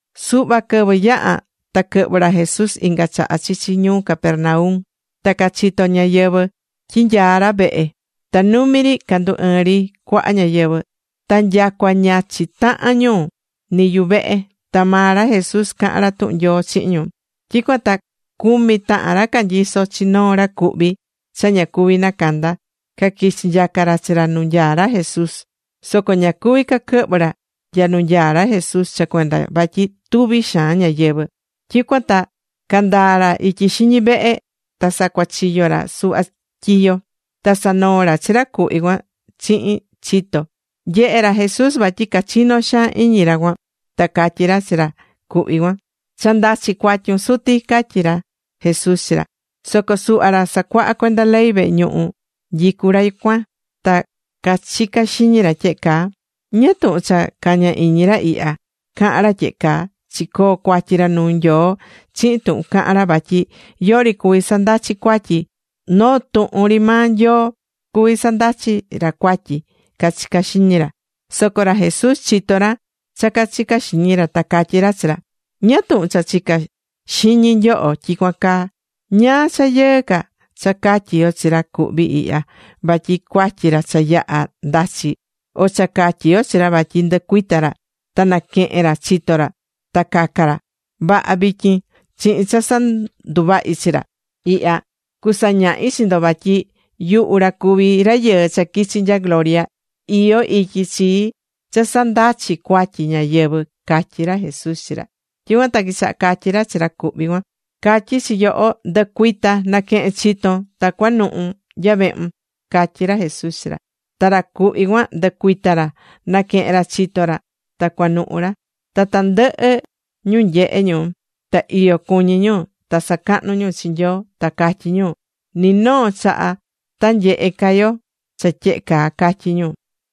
Suhva quɨvɨ yaha̱ ta quɨhvɨ̱ ra Jesús inga chaha chichi ñuu Capernaum. Ta cachito̱ ñáyɨvɨ tyi nyaá ra vehe. Ta numi ri candu ɨɨ̱n ri cuaha ñáyɨvɨ. Ta nyacua ña chitaha̱n ñu, ni yuvehe. Ta maa ra Jesús caha̱n ra tuhun Nyoo chihin ñu. Tyicuan ta cumi tahan ra canyisó chi noo ra cuhví cha ña cuví nacanda, caquichí nyaca ra chi ra nu nyaá ra Jesús. Soco ña cuví caquɨhvɨ ra nya nu nyaá ra Jesús cha cuenda vatyi tuvi xaan ñáyɨvɨ. Tyicuan ta candaa̱ ra ityi xiñi vehe. Ta sacuachiyo̱ ra suhva tyiyo. Ta sanoo̱ ra chi ra cuhví cuan chihin chito. Nyehe̱ ra Jesús vatyi cachinó xaan iñi ra cuan. Ta catyí ra chi ra cuhví cuan: ―Cha ndachi̱ cuatyun, suti ―catyí ra Jesús chi ra. Soco suhva ra sacuahá cuenda ley vehe ñuhu nyicú ra cuan, ta cachicá xiñi ra tyehe caa: “¿Ñáá tuhun cha cañá iñi ra ihya cahan ra tyehe caa? Chicoo̱ cuatyi ra nuu Nyoo chihin tuhun caha̱n ra vatyi yori cuví sandachi cuatyi, noo tuhun ri maa Nyoo cuví sandachi ra cuatyi”, cachicá xiñi ra. Soco ra Jesús chitó ra cha cachicá xiñi ra. Ta catyi ra chi ra: ―¿Ñáá tuhun cha chicá xiñi nyoho tyicuan caa? ¿Ñáá cha yɨɨ ca, cha catyi yo chi ra cuhví ihya vatyi cuatyi ra cha yaha̱ ndachi, o cha catyi yo chi ra vatyi nducuita ra ta naquehen ra chito ra ta caca ra? Vaha, vityin chihin cha sanduvahi chi ra ihya, cusañahi chi ndo vatyi yuhu ra cuví Rayɨɨ cha quichi̱ nya gloria, iyó ityi chii cha sandachi cuatyi ñáyɨvɨ ―catyí ra Jesús chi ra. Tyicuan ta quichaha catyí ra chi ra cuhví cuan: ―Catyí chi yoho, ndɨ̱cuita, na̱quehen chiton, ta cua̱nuhu nya vehun ―catyí ra Jesús chi ra. Ta ra cuhví cuan ndɨcuita̱ ra. Naquehe̱n ra chito ra, ta cuanuhu ra. Ta tandɨhɨ ñu nyehe̱ ñu, ta iyo cuñí ñu, ta sacahnú ñu chi Nyoo, ta catyí ñu: ―Ni noo chaha ta nyehe ca yo cha tyehe caa ―catyí ñu.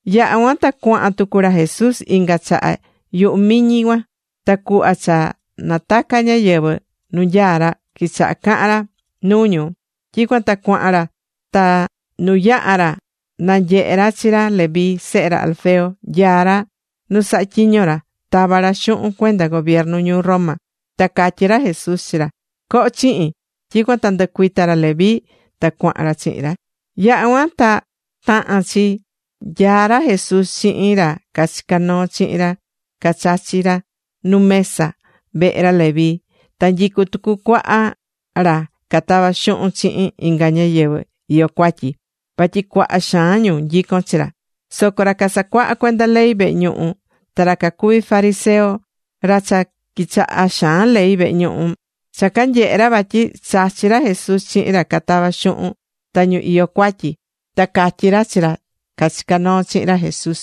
Yaha̱ cuan ta cuahan tucu ra Jesús inga chaha yuhu miñi cuan. Ta cuhva cha nataca̱ ñáyɨvɨ nu nyaá ra, quichaha cahan ra nuu ñu. Tyicuan ta cuahan ra ta nu yaha̱ ra nanyehe̱ ra chi ra Leví sehe ra Alfeo, nyaá ra nu sahá tyiño ra, tavá ra xuhun cuenda gobiernu ñuu Roma. Ta catyí ra Jesús chi ra: ―Co̱ho chihin. Tyicuan ta nducuita̱ ra Leví, ta cuahan ra chihin ra. Yaha̱ cuan ta taha̱n chi nyaá ra Jesús chihin ra cachicá noo chihin ra cachachí ra nu mesa vehe ra Leví. Ta nyicú tucu cuaha ra catavá xuhun chihin inga ñáyɨvɨ iyó cuatyi. Vatyi cuaha xaan ñu nyicón chi ra. Soco ra casacuahá cuenda ley vehe ñuhu, ta ra cacuví fariseo, ra cha quichahá xaan ley vehe ñuhu, cha canyehe̱ ra vatyi chachí ra Jesús chihin ra catavá xuhun, ta ñu iyó cuatyi, ta cacatyi̱ ra chi ra cachicá noo chihin ra Jesús: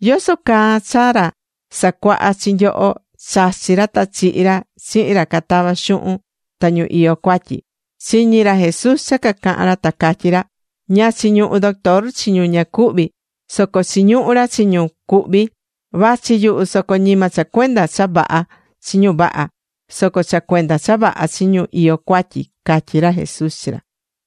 ―¿Yoso caa cha ra sacuaha chi nyoho chachí ra ta chihí ra chihin ra catavá xuhun ta ñu iyó cuatyi? Chiñi̱ ra Jesús cha cacaha̱n ra ta catyí ra: ―Ña chiñuhú doctor chi ñu ña cuhví, soco chiñuhú ra chi ñu cuhví. Vachi yuhu soco ñima cha cuenda cha vaha chi ñu vaha, soco cha cuenda cha vaha chi ñu iyó cuatyi ―catyí ra Jesús chi ra.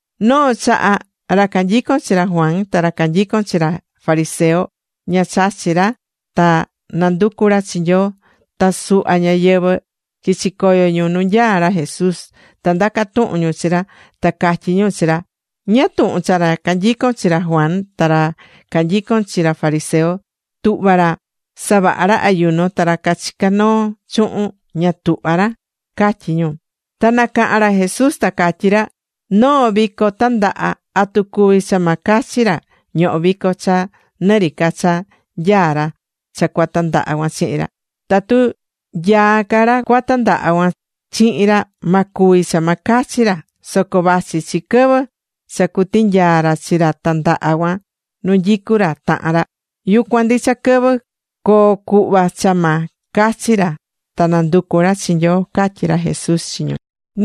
Noo chaha, ra canyicón chi ra Juan ta ra canyicón chi ra fariseo, ña chachí ra ta nanducú ra chi Nyoo. Ta suhva ñáyɨvɨ quichi̱ coyo ñu nu nyaá ra Jesús, ta ndaca̱ tuhun ñu chi ra, ta catyí ñu chi ra: ―¿Ñáá tuhun cha ra canyicón chi ra Juan ta ra canyicón chi ra fariseo tuhvá ra savaha ra ayuno, ta ra cachicá noo chuhun ña tuhvá ra? ―catyí ñu. Ta nacaha̱n ra Jesús ta catyí ra: ―Noo vico tandaha, ¿atu cuví cha ma cachi ra ñohó vico cha nɨ ri ca cha nyaá ra cha cua tandaha cuan chihin ra? Tatu nyaá ca ra cua tandaha cuan chihin ra, ma cuvi cha ma cachi ra. Soco vachi chi quɨvɨ cha cutinyaa ra chi ra tandaha cuan nu nyicú ra tahan ra. Yucuan ndicha quɨvɨ coo cuhva cha ma cachi ra ta nanducu ra chi Nyoo ―catyí ra Jesús chi ñu.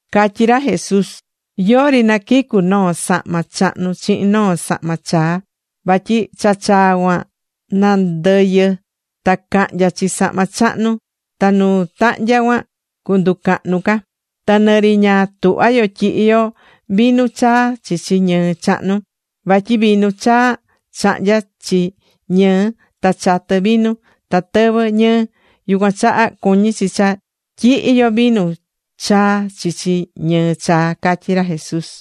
Catyí ra Jesús: ―Yori naquicu noo sahma chahnu chihin noo sahma chaa, vatyi cha chaa cuan nandɨyɨ ta cahnya chi sahma chahnu, ta nu tahnya cuan cunducahnu ca. Ta nɨ ri ña tuhvá yo tyihi yo vinu chaa chichi ñɨɨ chahnu, vatyi vinu chaa chahnyá chi ñɨɨ, ta chatɨ vinu, ta tɨvɨ ñɨɨ. Yucuan chaha cuñí chi cha tyihi yo vinu chaa chichi ñɨɨ chaa ―catyí ra Jesús.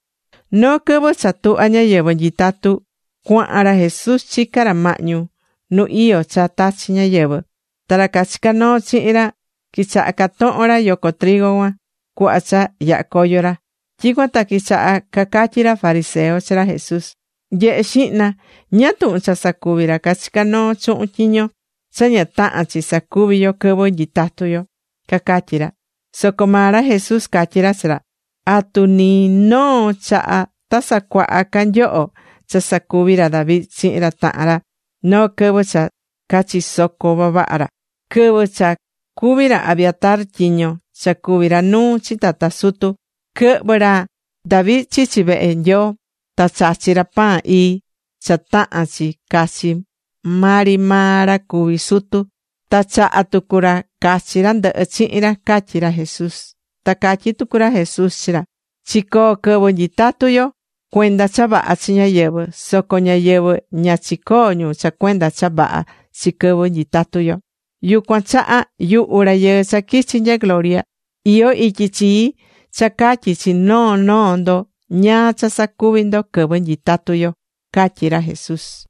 Noo quɨvɨ cha tuhvá ñáyɨvɨ nyitatu, cuahan ra Jesús chicá ra mahñu nu iyó cha tachi̱ ñáyɨvɨ. Ta ra cachicá noo chihin ra quichaha catohon ra yoco trigo cuan cuhva cha yahá coyo ra. Tyicuan ta quichaha cacatyí ra fariseo chi ra Jesús: ―¡Nye̱he xihna! ¿Ñáá tuhun cha sacuví ra cachicá noo chuhun tyiño cha ña tahán chi sacuví yo quɨvɨ nyitatú yo? ―cacatyí ra. Soco maa ra Jesús catyí ra chi ra: ―¿Atu ni noo chaha ta sacuaha ca nyoho cha sacuvi̱ ra David chihin ra tahan ra noo quɨvɨ cha cachisoco̱ vavaha ra? Quɨvɨ cha cuví ra Abiatar tyiño cha cuví ra nuu chi tata sutu, quɨhvɨ̱ ra David chichi vehe Nyoo. Ta chachí ra pan ii, cha tahán chi cachi maa ri maa ra cuví sutu. Ta chaha̱ tucu ra cachi ra ndɨhɨ chihin ra ―catyí ra Jesús. Ta catyí tucu ra Jesús chi ra: ―Chicoo quɨvɨ nyitatú yo, cuenda cha vaha chi ñáyɨvɨ, soco ñáyɨvɨ ña chicoo ñu cha cuenda cha vaha chi quɨvɨ nyitatu yo. Yucuan chaha yuhu Rayɨɨ cha quichi̱ nya gloria, iyó ityi chii cha catyi chi noo noo ndo ñáá cha sacuvi ndo quɨvɨ nyitatú yo ―catyí ra Jesús.